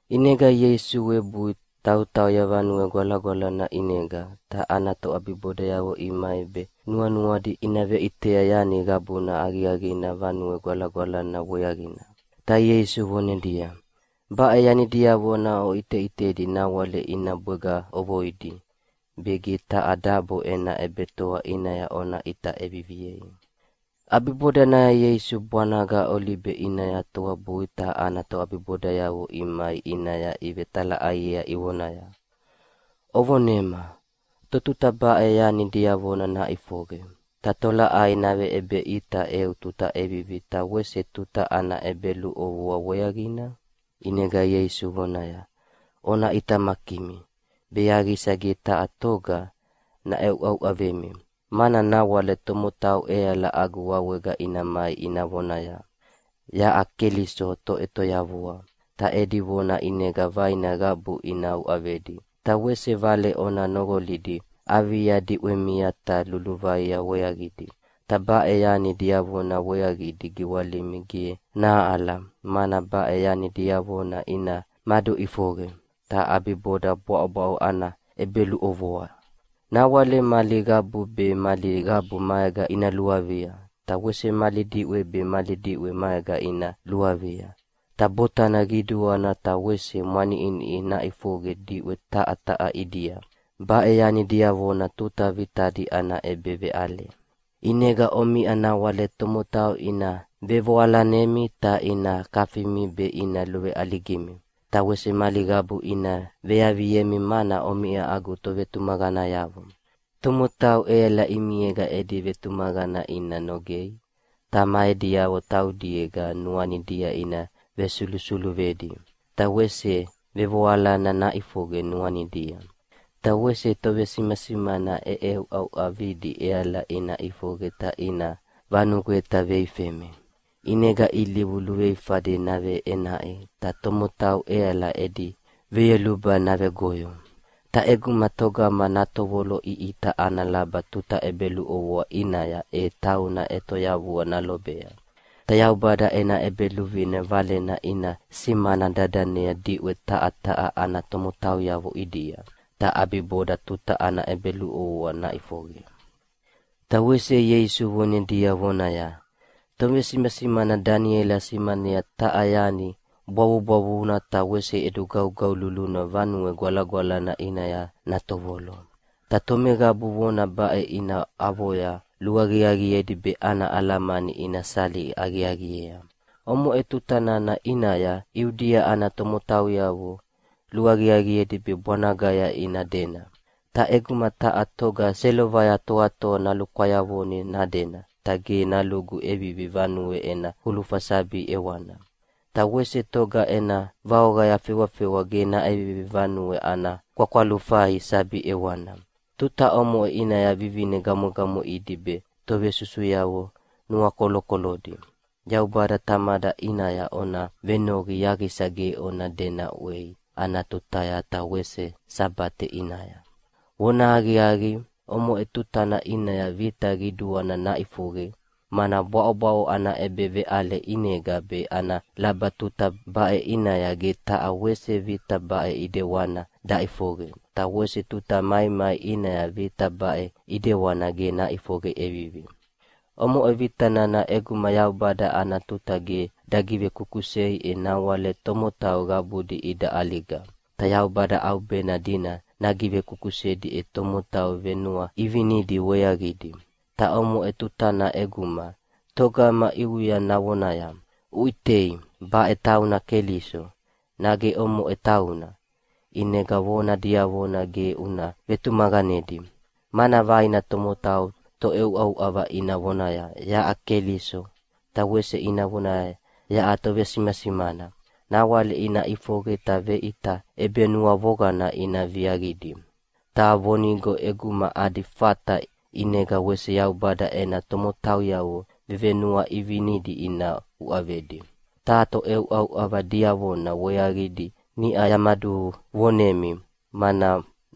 ʼInega Ieisu webui tautauya Vanue Gwalagwalana ʼinega, ta ana toʼabibodayavo imai be nuanuadi ina veʼitea yani qabuna aqiaqina Vanue Gwalagwalana weaqina. Ta Ieisu vonedia, “Baʼe yanidiavo oʼiteʼitedia nawale ina bwega ʼovoidi, be ge taha dabo ena ʼebetoa ʼinaya ona ʼita ʼeviviei.” ʼAbibodanaya Ieisu bwanaga Olibe ʼinaya toabui ta ana toʼabibodayavo imai ʼinaya ivetalaʼaiea ivonaya, “Uvonema, totuta baʼe yani diavona naʼifoqe, ta tolaʼai naveʼebeʼita eu tuta ʼevivi ta wese tuta ana ʼebeluʼovoa weaqina?” ʼInega Ieisu vonaya, “Ona ʼitamakimi, be yaqisa ge taha toga naʼeuʼauʼavemi, mana nawale tomotau ʼeala agu wawega ina mai ina vonaya, ‘Yaʼa Keliso Toʼetoyavua!’ ta edi vona ʼinega vaina qabu ina uʼavedi. Ta wese vale ona noqolidi avia diʼwemia ta luluvaia weaqidi, ta baʼe yani diavona weaqidi giwalimi ge nahaʼala, mana baʼe yani diavona ina maduʼifoqe, ta ʼabiboda bwaʼobwaʼo ana ʼebeluʼovoa. Nawale mali qabu be mali qabu maega ina luavia, ta wese mali diʼwe be mali diʼwe maega ina luavia. Ta botana qiduana ta wese mwaniʼiniʼi naʼifoqe diʼwe taha taha ʼidia. Baʼe yani diavona tuta vitadi ana ʼebeveʼale. “ʼInega omiʼa nawale tomotau ina vevoalanemi ta ina kafimi be ina luveʼaligimi. Ta wese mali qabu ina veaviemi mana omiʼa agu tovetumaqanayavo. Tomotau ʼeala ʼimiega edi vetumaqana ina nogei, ta ma ediavo taudiega nuanidia ina vesulusuluvedi. Ta wese vevoalana naʼifoqe nuanidia. Ta wese tovesimasimana ʼeʼeuʼauʼavidi ʼeala ina ʼifoqe ta ina vanugweta veifemi. ʼInega ilivu luveifadi naveʼenaʼi, ta tomotau ʼeala edi veyoluba navegoyo. Ta ʼeguma togama natovoloʼiʼita ana laba tuta ʼebeluʼovoa ʼinaya e tauna ʼetoyavua nalobea. Ta Yaubada ena ʼEbeluvine valena ina simana dadanea diʼwe taha taha ana tomotauyavo ʼidia, ta ʼabiboda tuta ana ʼebeluʼovoa naʼifoqe.” Ta wese Ieisu vonedi vonaya, “Tovesimasimana Daniela simanea taha yani bwavubwavuna ta wese ʼedugaugaululuna Vanue Gwalagwalana ʼinaya natovolo. (Ta tomeqabu vona baʼe ina avoya luaqiaqiedi be ana alamani ina sali aqiaqiea.) Omoʼe tuta nana ʼinaya Iudia ana tomotauyavo luaqiaqiedi be bwanagaya ina dena. Ta ʼeguma taha toga selovaya toatoa nalukwayavoni nadena, ta ge nalugu ʼevivi vanuea ena kulufa sabi ʼewana. Ta wese toga ena vaoqaya fewafewa ge naʼevivi vanuea ana kwakwalufai sabi ʼewana. Tuta omoʼe ʼinaya vivine gamwegamweʼidi be tovesusuyavo nuakolokolodi. Yaubada Tamada ʼinaya ona venoqi yaqisa ge ona dena ʼwei ana tutaya ta wese Sabate ʼinaya. “Vonahaqiaqi, omoʼe tutana ʼinaya vita qiduana naʼifoqe, mana bwaʼobwaʼo ana ʼebeveʼale ʼinega be ana laba tuta baʼe ʼinaya ge taha wese vita baʼe ʼidewana daʼifoqe, ta wese tuta maimai ʼinaya vita baʼe ʼidewana ge naʼifoqe ʼevivi. Omoʼe vita nana ʼeguma Yaubada ana tuta ge dagivekusei e nawale tomotau qabudi ida ʼaliga. Ta Yaubada ʼaubena dina nagivekusedi ena tomotau vevenuaʼivinidi weaqidi. Ta omoʼe tutanaya ʼeguma togama ʼiuya navonaya, ‘Uʼitei, baʼe tauna Keliso!’ nage ‘Omoʼe tauna!’ ʼinega vona diavona ge una vetumaqanedi. Mana vaina tomotau toʼeuʼauʼava ina vonaya ‘Yaʼa Keliso!’ ta wese ina vonaya ‘Yaʼa tovesimasimana!’ Nawale ina ʼifoqe ta veʼita ʼebenuavoqana ina viaqidi. Ta vonigo ʼeguma adi fata ʼinega wese Yaubada ena tomotauyavo vevenuaʼivinidi ina uʼavedi. Ta toʼeuʼauʼava diavona weaqidi niʼa yamaduvonemi, mana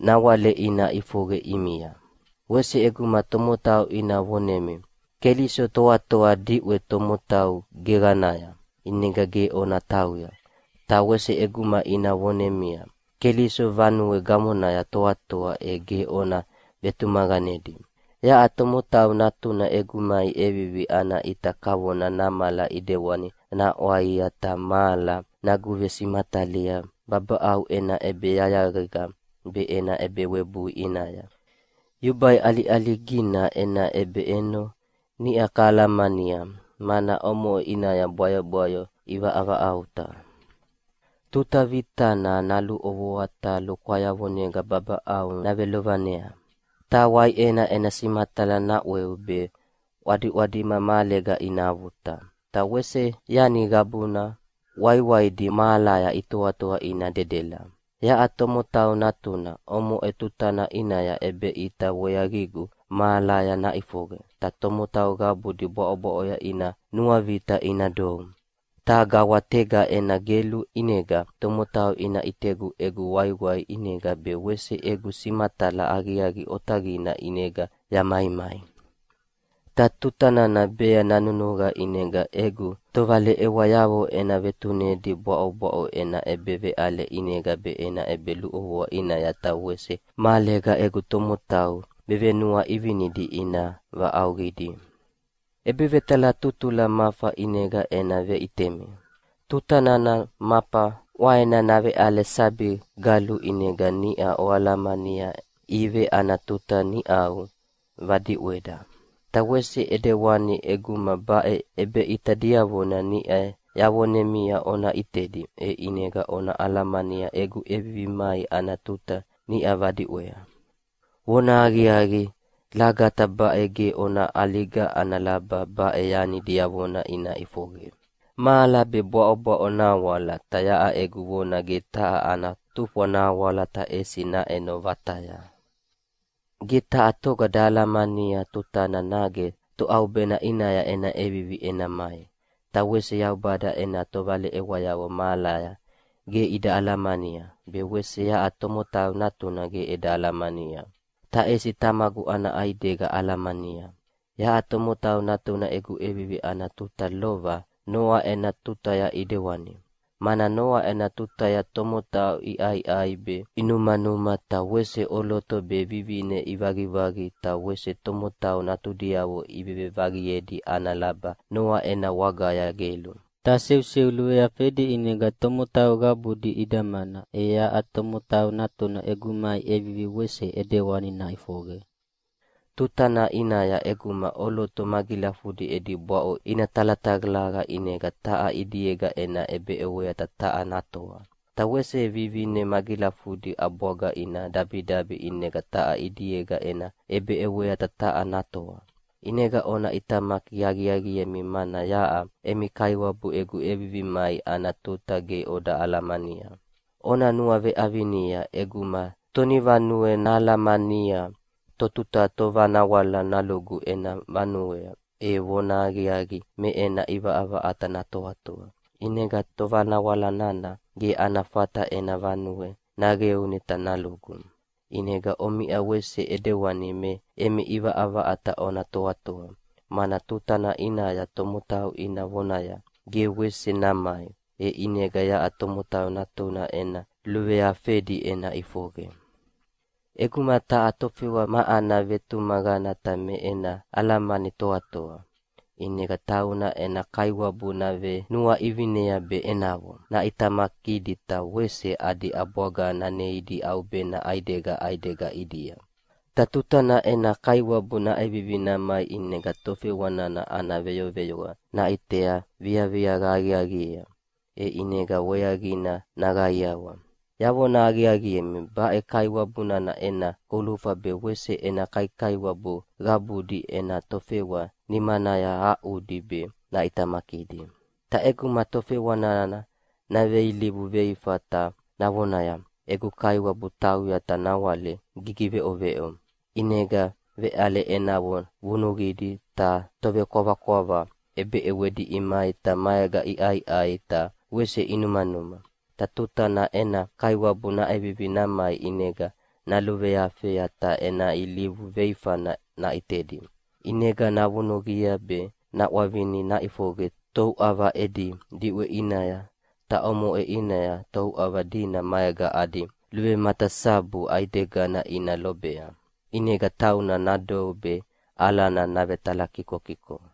nawale ina ʼifoqe ʼimia. “Wese ʼeguma tomotau ina vonemi, ‘Keliso toatoa diʼwe tomotau geqanaya’, ʼinega ge ona tauya. Ta wese ʼeguma ina vonemi, ‘Keliso vanue gamonaya toatoa’, e ge ona vetumaqanedi. Yaʼa Tomotau Natuna egu mai ʼevivi ana ʼita kavona namala ʼidewani naʼwaia ta mahala naguvesimatalia babaʼau ena ʼebeyayaqega be ena ʼebewebui ʼinaya. “Yubai ʼaliʼaligina ena ʼebeʼeno niʼa kahalamania, mana omoʼe ʼinaya bwayobwayo ivavaʼauta. ‘Tuta vitana naluʼovoa ta lukwayavonega babaʼau navelovanea, ta waiʼena ena simatala naʼweu, be ʼwadiʼwadima mahalega ina avuta, ta wese yani qabuna waiwaidi mahalaya itoatoa ina dedela.’ “Yaʼa Tomotau Natuna, omoʼe tutana ʼinaya ʼebeʼita weaqigu mahalaya naʼifoqe, ta tomotau qabudi bwaʼobwaʼoya ina nuavita ina dou. Ta gawatega ena gelu ʼinega tomotau ina ʼitegu egu waiwai ʼinega be wese egu simatala aqiaqi otaqina ʼinega yamaimai. Ta tuta nana bea nanunuqa ʼinega egu tovaleʼewayavo ena vetunedi bwaʼobwaʼo ena ʼebeveʼale ʼinega be ena ʼebeluʼovoa ʼinaya ta wese mahalega egu tomotau vevenuaʼivinidi ina vaʼauqidi. “ʼEbevetalatutula mafa ʼinega ena veʼitemi. Tuta nana mafa ʼwaena naveʼale sabi galu ʼinega niʼa oalamania ive ana tuta niʼau vadiʼweda. Ta wese ʼidewani ʼeguma baʼe ʼebeʼita diavona niʼa yavonemia ona ʼitedi, e ʼinega ona alamania egu ʼevivi mai ana tuta niʼa vadiʼwea. Vonahaqiaqi lagata baʼe ge ona ʼaliga ana laba baʼe yani diavona ina ʼifoqe. Mahala be bwaʼobwaʼo nahawala, ta yaʼa egu vona ge taha ana tufwa nahawala ta ʼesi naʼeno vataya. “Ge taha toga dahalamania totuta nage toʼaubena ʼinaya ena ʼevivi ena mai, ta wese Yaubada ena tovaleʼewayavo mahalaya ge ida alamania, be wese yaʼa Tomotau Natuna ge eda alamania. Ta ʼesi Tamagu ana ʼaidega alamania. Yaʼa Tomotau Natuna egu ʼevivi ana tuta lova Noa ena tutaya ʼidewani. Mana Noa ena tutaya tomotau iʼaiʼai be inumanuma ta wese ʼoloto be vivine ivaqivaqi ta wese tomotau natudiavo ivevevaqiedi ana laba Noa ena wagaya gelu. Ta seuseu luveafedi ʼinega tomotau qabudi idamana, e yaʼa Tomotau Natuna egu mai ʼevivi wese ʼidewani naʼifoqe. “Tuta nana ʼinaya ʼeguma ʼoloto magilafudi edi bwaʼo ina talatalaqa ʼinega taha ʼidiega ena ʼebeʼewea ta taha natoa. Ta wese vivine magilafudi ʼabwaga ina dabidabi ʼinega taha ʼidiega ena ʼebeʼewea ta taha natoa. ʼInega ona ʼitamaki aqiaqiemi mana yaʼa emi Kaiwabu egu ʼevivi mai ana tuta ge oda alamania. Ona nuaveʼavinia, ʼeguma tonivanue nahalamania totuta tovanawala nalugu ena vanuea, e vonahaqiaqi me ena ʼivaʼavaʼata natoatoa, ʼinega tovanawala nana ge ana fata ena vanue naqeuni ta nalugu. ʼInega omiʼa wese ʼidewani me emi ʼivaʼavaʼata ona toatoa, mana tuta nana ʼinaya tomotau ina vonaya, ‘Ge wese namai!’ e ʼinega yaʼa Tomotau Natuna ena luveafedi ena ʼifoqe. “ʼEguma taha tofewa ma ana vetumaqana ta me ena alamani toatoa, ʼinega tauna ena kaiwabu navenuaʼivinea be enavo naʼitamakidi ta wese adi ʼabwaga naneidi ʼaubena ʼaidega ʼaidega ʼidia. Ta tuta nana ena kaiwabu naʼevivi namai ʼinega tofewa nana ana veyoveyoa naʼitea viaviaqa aqiaqiea, e ʼinega weaqina naqaiawa. Yavona aqiaqiemi, baʼe kaiwabu nana ena kulufa be wese ena kaikaiwabu qabudi ena tofewa nimanaya nahaʼudi be naʼitamakidi. “Ta ʼeguma tofewa nana naveilivu veifa ta navonaya, ‘Egu kaiwabu tauya ta nawale gigiveʼoveʼo’, ʼinega veʼale enavo vunuqidi, ta tovekwavakwava ʼebeʼewedi imai ta maega iʼaiʼai ta wese inumanuma. Ta tuta nana ena kaiwabu naʼevivi namai ʼinega naluveafea ta ena ilivu veifana naʼitedi. ʼInega navunuqia be naʼwavinia naʼifoqe touʼava edi diʼwe ʼinaya, ta omoʼe ʼinaya touʼava dina maega adi luvematasabu ʼaidegana ina lobea, ʼinega tauna nadou be alana navetalakikokiko.”